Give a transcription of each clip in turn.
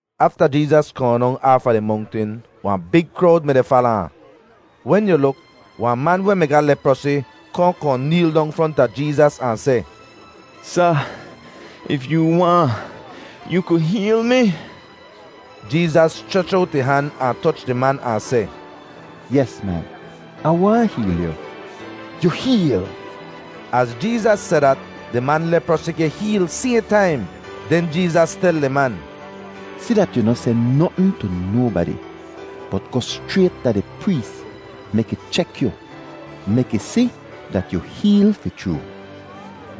Afta Jeezas kohn dong fahn aafa di mongtin, wahn big krowd mi-di fala ahn. Wen yu luk, wahn man weh mi ga leprosi kohn kohn neel dong fronta Jeezas ahn seh, “Sa, if yoo waahn, yoo ku heel mi.” Jeezas schrech owt ih han ahn toch di man ahn seh, “Yes, man, Ah waahn heel yu. Yu heel!” Az Jeezas seh dat, di man leprosi geh heel sayhn taim. Den Jeezas tel di man, “Si dat yu noh seh notn tu nobadi; bot goh schrayt da di prees mek ih chek yu mek ih si dat yu heel fi chroo.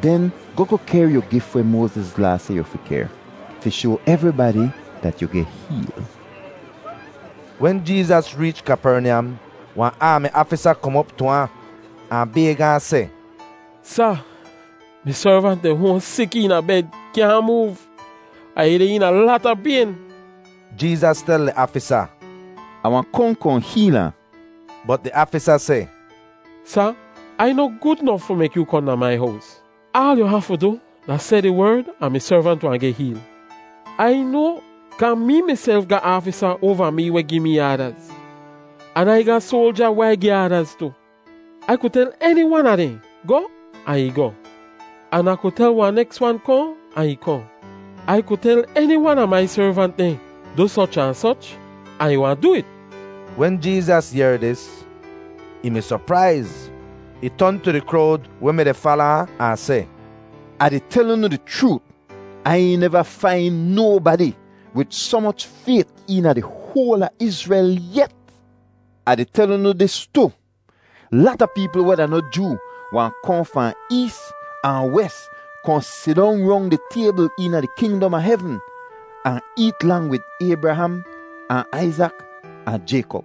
Den goh goh kehr yu gif weh Moaziz Laa seh yu fi kehr, fi shoa evribadi dat yu geh heel.” Wen Jeezas reech Kapernyam, wahn aami aafisa kom op tu ahn, ahn bayg ahn seh, “Sa, mi servant deh hoahn sik eena bed kyaahn moov, ahn ih deh eena lata payn.” Jeezas tel di aafisa, “Ah wahn kohn kohn heel ahn.” Bot di aafisa seh, “Sa, Ai noh gud nof fi mek yoo kohn da mai hows. Aal yu hafu du da seh di werd, ahn mi servant wahn geh heel. Ai noa, kaa mee miself ga aafisa oava mee weh gi mee aadaz, an Ai ga soalja weh Ai gi aadaz tu. Ai ku tel eni wan a dehn, ‘Goh!’ ahn ih goh. An Ah ku tel wahn neks wan, ‘Kohn!’ ahn ih kohn. Ai ku tel eni wan a mai servant dehn, ‘Du soch ahn soch,’ ahn ih wahn du it.” Wen Jeezas yehr dis, ih mi sopraiz. Ih ton tu di krowd weh mi-di fala ahn, ahn seh, “Ah di tel unu di chroot, Ai neva fain nobadi wid soh moch fayt eena di hoal a Izrel yet! Ah di tel unu dis tu, lata peepl weh da noh Joo wahn kohn fahn ees ahn wes kohn sidong rong di taybl eena di kingdom a hevn ahn eet lang wid Aybraham ahn Aizak ahn Jaykop.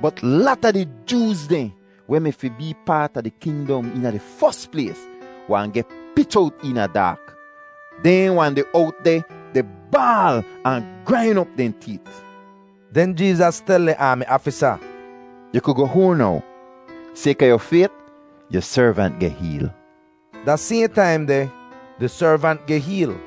Bot lata di Jooz dehn weh mi fi bee paat a di kingdom eena di fos plays wahn geh pich owt eena daak. Dehn wahn deh owt deh di baal ahn grain op dehn teet.” Den Jeezas tel di aami aafisa, “Yu ku goh hoahn now. Sayka yu fayt, yu servant geh heel.” Da sayhn taim deh, di servant geh heel.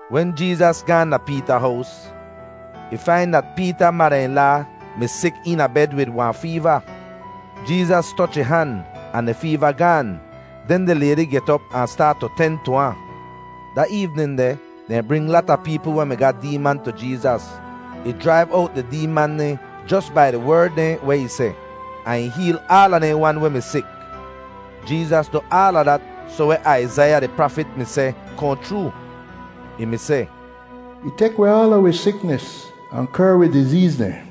Wen Jeezas gaahn da Peeta hows, ih fain dat Peeta mada-in-laa mi sik eena bed wid wahn feeva. Jeezas toch ih han, ahn di feeva gaan; den di laydi get op ahn staat tu ten tu ahn. Da eevnin deh, dehn bring lata peepl weh mi ga deeman tu Jeezas. Ih jraiv owt di deeman dehn jos bai di werd dehn weh ih seh, ahn ih heel aala dehn wan weh mi sik. Jeezas du aala dat soh weh Aizaiya di prafit mi seh kohn chroo. Ih mi seh, “Ih tek weh aala wi siknis ahn kehr wi dizeez dehn.”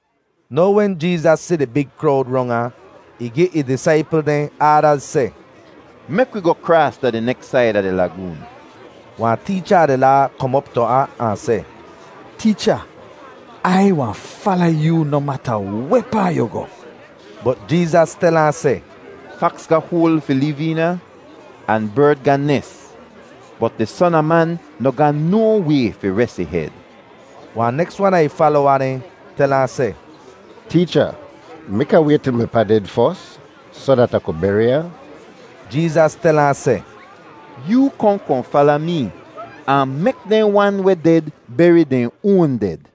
Now wen Jeezas si di big krowd rong ahn, ih gi ih disaipl dehn aadaz seh, “Mek wi goh kraas da di neks said a di lagoon.” Wahn teecha a di Laa kom op tu ahn, ahn seh, “Teecha, Ai wahn fala yoo noh mata wehpaa yu goh.” Bot Jeezas tel ahn seh, “Faks ga hoal fi liv eena, ahn berd ga nes, bot di Son a Man noh ga no way fi res ih hed.” Wahn neks wan a ih falowa dehn tel ahn seh, “Teecha, mek Ah wayt til mi pa ded fos, soh dat Ah ku beri ahn.” Jeezas tel ahn seh, “Yoo kohn kohn fala mee, ahn mek dehn wan weh ded beri dehn oan ded.”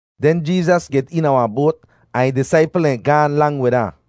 Den Jeezas get eena wahn boat ahn ih disaipl dehn gaahn lang wid ahn.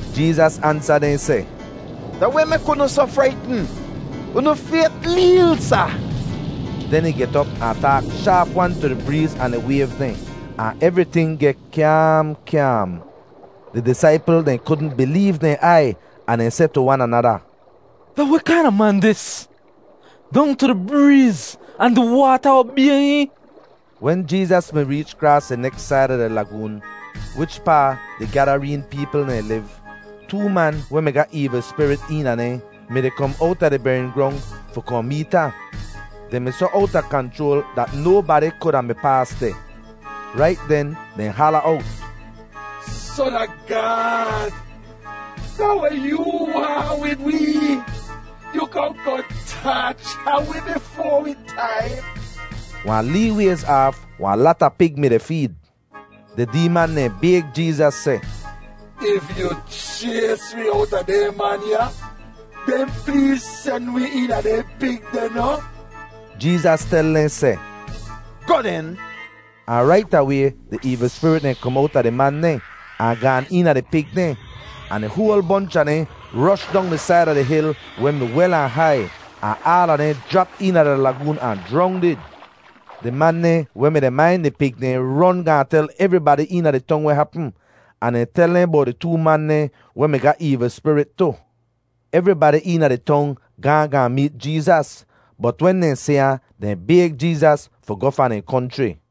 Jeezas ansa dehn seh, “Da weh mek unu soh fraitn? Unu fayt leel, sa!” Den ih get op ahn taak shaap-wan tu di breez ahn di wayv dehn ahn evriting geh kyaam kyaam. Di disaipl dehn kudn bileev dehn aiy ahn dehn seh tu wan anada, “Da weh kaina man dis? Dong tu di breez ahn di waata obay hihn!” Wen Jeezas mi reech kraas di neks said a di lagoon, wichpaa di Gadareen peepl dehn liv, too man weh mi ga eevl spirit eena dehn mi-di kom owta di bering grong fi kohn meet ahn. Dehn mi soh owta kanchroal dat nobadi kuda mi paas deh. Rait den dehn hala owt, “Son a Gaad, da weh yoo waahn wid wee? Yu kohn kohn taacha wi bifoa wi taim?” Wahn lee wayz aaf wahn lata pig mi-di feed. Di deeman dehn bayg Jeezas seh, “If yu chays wi owta dehn man ya, den pleez sen wi eena dehn pig deh noh!” Jeezas tel dehn seh, “Goh, den.” Ahn rait away di eevl spirit dehn kom owta di man dehn ahn gaan eena di pig dehn, ahn di hoal bonch a dehn rosh dong di said a di hil weh mi wel ahn hai, ahn aala dehn jrap eena di lagoon ahn jrongdid. Di man dehn weh mi-di main di pig dehn ron gaahn tel evribadi eena di tong weh hapm, ahn dehn tel dehn bowt di too man dehn weh mi ga eevl spirit tu. Evribadi eena di tong gaahn gaahn meet Jeezas. Bot wen dehn si ahn, dehn bayg Jeezas fi goh fahn dehn konchri.